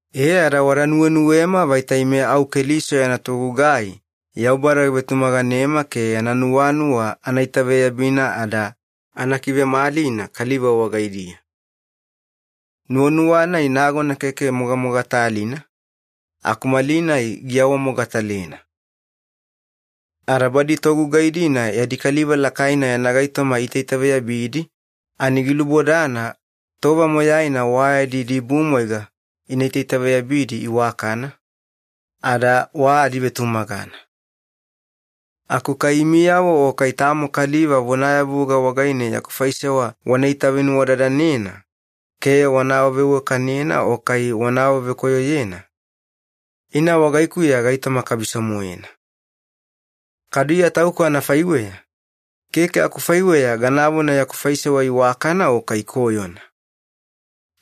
E ada wada nuwenuwema vaita ime au Keliso yana togugai Yaubada givetumaganema ke yana nuwanuwa ana itaveyabina ada ana kivemalina kaliva wagaidiya. Nuwanuwa-nai nagona keke mogamogatalina, aku malinai giawamogatalena. Ada badi togugai-dina yadi kaliva lakaina yana gaitoma iitaitaveyabidi ani gilubodana tova moyaina wa yadi idibumwaiga ina itaitaveyabidi iwakana, ada wa adivetumagana. Aku kai imiyavo o kai tamo kaliva vonayavuga wagaine yaku faisewa wana itavenuwadadanena ke wana awaveiwakanena o kai wana awavekoyoyena, ina wagaikuya gaitoma kabiso-moena. Kadu Iya tauku anafaiweya, keke akufaiweya ganavona yaku faisewa iwakana o kai koyona.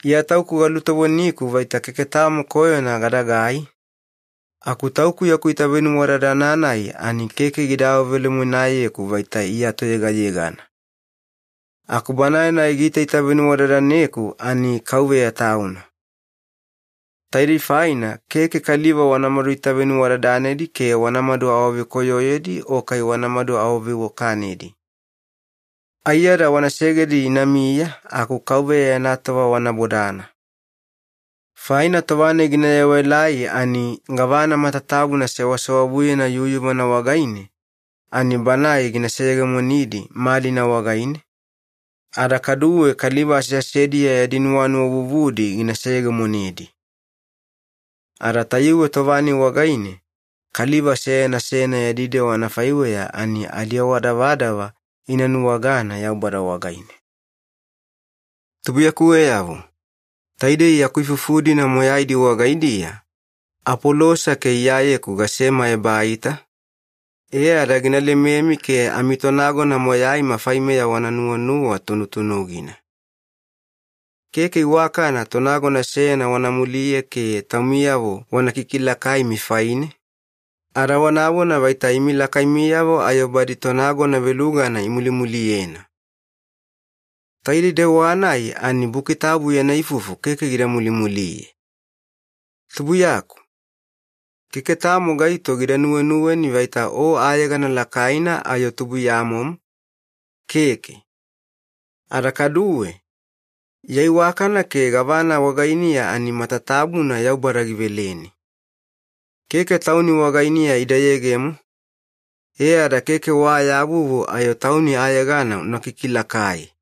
Iya tauku galutovoniku vaita keke tamo koyona gadagai, aku tauku yaku itavenuwadadana-nai ani keke gida awavelemoenayeku vaita Iya toyegayegana. Aku Banae-nai giitaita venuwadadaneku ani Kauveya Tauna. Taidei faina keke kaliva wanamadu itavenuwadadanedi ke wanamadu awavekoyoyedi o kai wanamadu awaveiwakanedi. Aiyada wana segedi inamiya aku Kauveya yana tova wana bodana. Faina tova-nai gina yewaelai ani gavana matatabuna sewasewavuyena yuyuvana wagaine ani Banae gina seyegemonedi malina wagaine, ada kaduwe kaliva aseasediya yadi nuwanuwa vuvudi gina seyegemonedi. Ada tayuwe tova-nai wagaine kaliva seyana seyana yadi dewa anafaiweya ani adiawadavadava ina nuwagana Yaubada wagaine. Tubuiyakuweyavo, taidei yaku ifufu-dina moyaidi wagaidiya Apolosa ke Iyayeku gasema ebaita, e ada gina lememi ke amitonagona moyaima faimeya wana nuwanuwa tunutunugina. Keke iwakana tonagona seyana wana muliye ke taumiyavo wana kikilakaimi faine, ada wanavona vaita imi lakaimiyavo ayo badi tonagona velugana imulimuliyena. Taidei dewa-nai ani Buki Tabu yana ifufu keke gida mulimuliye. Tubuiyaku, keke tamo gaito gida nuwenuweni vaita o ayegana lakaina ayo tubuiyamomo, keke. Ada kaduwe, ya iwakana ke gavana wagainiya ani matatabuna Yaubada giveleni. Keke tauni wagainiya ida yegemo, e ada keke wa ya vuvu ayo tauni ayegana una kikilakai.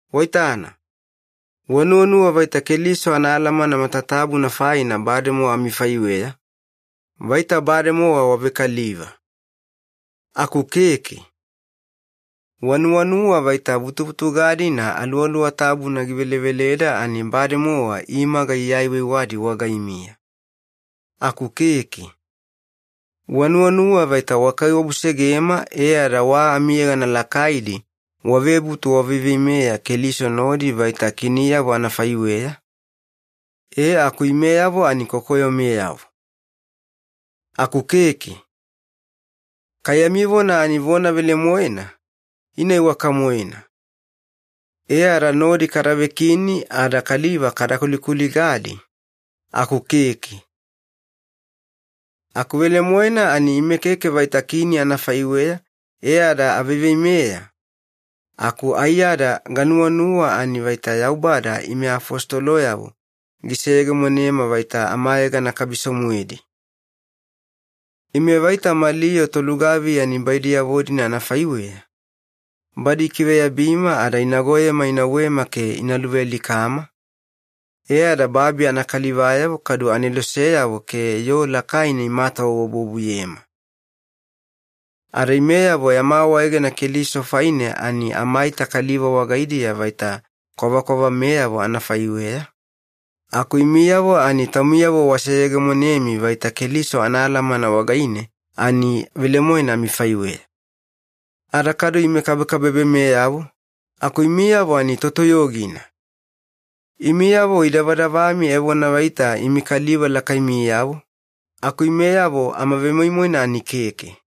Waitana, wanuwanuwa vaita Keliso anaalamana matatabuna faina bademowa amifaiweya, vaita bademowa wavekaliva. Aku keke. Wanuwanuwa vaita vutuvutuga-dina Aluwaluwa Tabuna giveleveleda ani bademowa imaga iaiwaiwadi wagaimiya. Aku keke. Wanuwanuwa vaita wakaiwabusegema e ada wa amiyegana lakaidi wavebutu waveiveimeya Keliso nodi vaita kiniyavo anafaiweya, e aku imeyavo ani kokoyomeyavo. Aku keke. Kai yami vona ani vona velemoena, ina iwaka-moena. E ada nodi kada vekini ada kaliva kada kulikuligadi, aku keke. Aku velemoena ani ime keke vaita kini anafaiweya e ada aveiveimeya, aku aiyada ganuwanuwa ani vaita Yaubada ime afositoloyavo giseyegemonema vaita amayegana kabiso-moedi. Ime vaita mali yoo tolugaviya nibaidiyavo-dina anafaiweya, badi ikiveyabima ada inagoyema inauwema ke ina luvealikama, e ada babi anakalivayavo kadu aneloseyavo ke yoo lakaina imatawabuwabuyema. Ada imeyavo yama awaegena Keliso faine ani amaita kaliva wagaidiya vaita kwavakwavameyavo anafaiweya, aku imiyavo ani taumiyavo waseyegemonemi vaita Keliso anaalamana wagaine ani velemoena amifaiweya. Ada kadu ime kabekabebemeyavo, aku imiyavo ani totoyogina! Imiyavo idavadavami evona vaita imi kaliva lakaimiyavo, aku imeyavo amavemoimoina ani keke.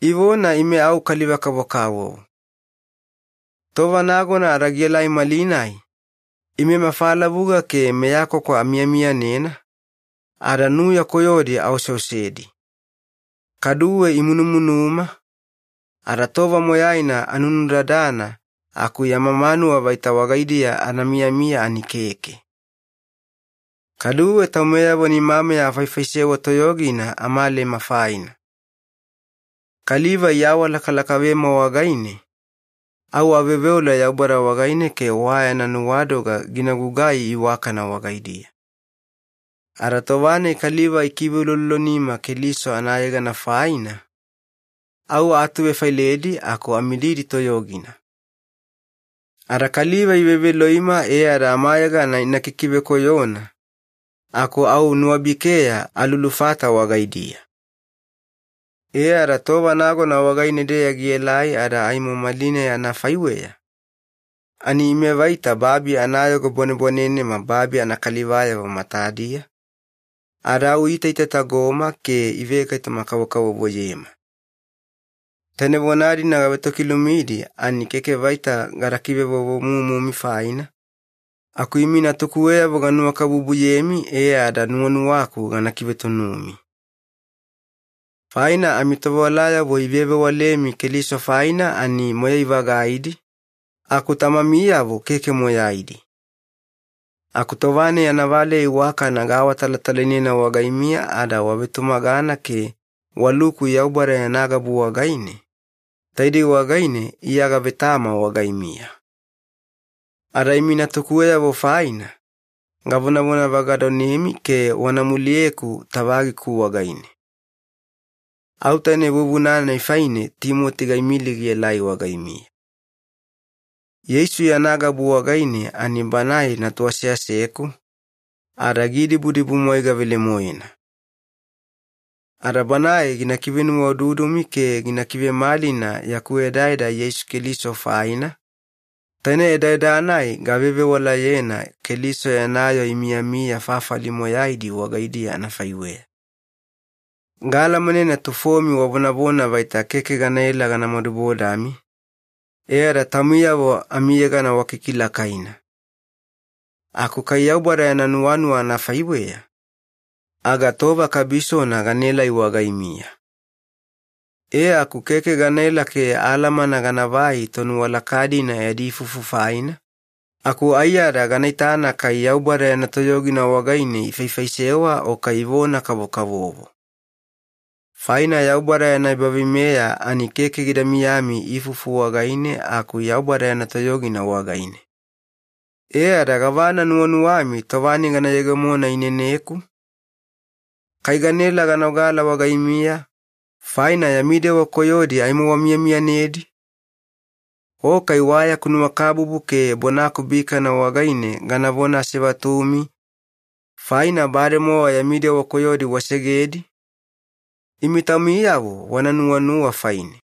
Ivona ime au kaliva-kavokavovo. Tova nagona ada gielai malinai, ime mafalavuga ke meyakwakwa amiyamiyanena, ada nuya koyodi aoseosedi. Kaduwe imunumunuma, ada tova moyaina anunudadana aku yama manuwa vaita wagaidiya ana miyamiya ani keke. Kaduwe taumeyavo nimameya afaifaisewa toyogina amalema faina. Kaliva iawalakalakavema wagaine, au aveoveola Yaubada wagaine ke wa yana nuwadoga gina gugai iwakana wagaidiya. Ada tova-nai kaliva ikiveuloulolonima Keliso anayegana faina, au aatuvefailedi aku amididi toyogina. Ada kaliva iveveloima e ada amayegana ina kikivekoyona, aku au nuwabikeya alulufata wagaidiya. E ada tova nagona wagaine-deya gielai ada aimo malinai anafaiweya, ani ime vaita babi anayogo bwanebwanenema babi anakalivayavo matadiya, ada au iitaitatagoma ke ivegaitoma-kavokavovoyema. Taine vona-dina gavetokilumidi ani keke vaita gada kivevovomumumi faina, aku imi natukuweyavo ganuwakabubuyemi e ada nuwanuwaku gana kivetunumi. Faina amitovewalayavo ivevewalemi Keliso faina ani moyai-vagaidi, aku tamamiyavo keke moyaidi. Aku tova-nai anavaleya iwakana gaawatalatalainena wagaimiya ada wavetumagana ke waluku Yaubada yana gabu wagaine, taidei wagaine Iya gavetama wagaimiya. Ada imi natukuweyavo faina, gavonavona vagadonemi ke wana muliyeku tavagiku wagaine. Au taine vuvuna-nai faine Timoti gaimili gielai wagaimiya. Yeisu yana gabu wagaine ani banae natu aseaseku, ada giidibudibumwaiga velemoena. Ada banae gina kivenuwaududumi ke gina kivemalina yaku edaeda Yeisu Keliso faina, taine edaeda-nai gavevewalayena Keliso yana yoo imiyamiya fafali moyaidi wagaidiya anafaiweya. Gaalamanena tufomi wavonavona vaita keke ganaela gana madubodami, e ada taumiyavo amiyegana wakikilakaina. Aku kai Yaubada yana nuwanuwa anafaiweya, aga tova kabisona ganaelai wagaimiya. E aku keke ganaela ke alamana ganavai tonuwalaka-dina yadi ifufu faina, aku aiyada gana itana kai Yaubada yana toyogina wagaine ifaifaisewa o kai ivona-kavokavovo. Faina Yaubada yana ebaveimeya ani keke gida miyami ifufu wagaine aku Yaubada yana toyogina wagaine. E ada gavana nuwanuwami tova-nai gana yegemona ineneku? Kai ganaela gana ogala wagaimiya, faina yami dewa koyodi aimo wamiyamiyanedi? O kai wa yaku nuwakabubu ke bonaku bikana wagaine ganavona asevatumi, faina bademowa yami dewa koyodi wasegedi? Imi taumiyavo wana nuwanuwa faine.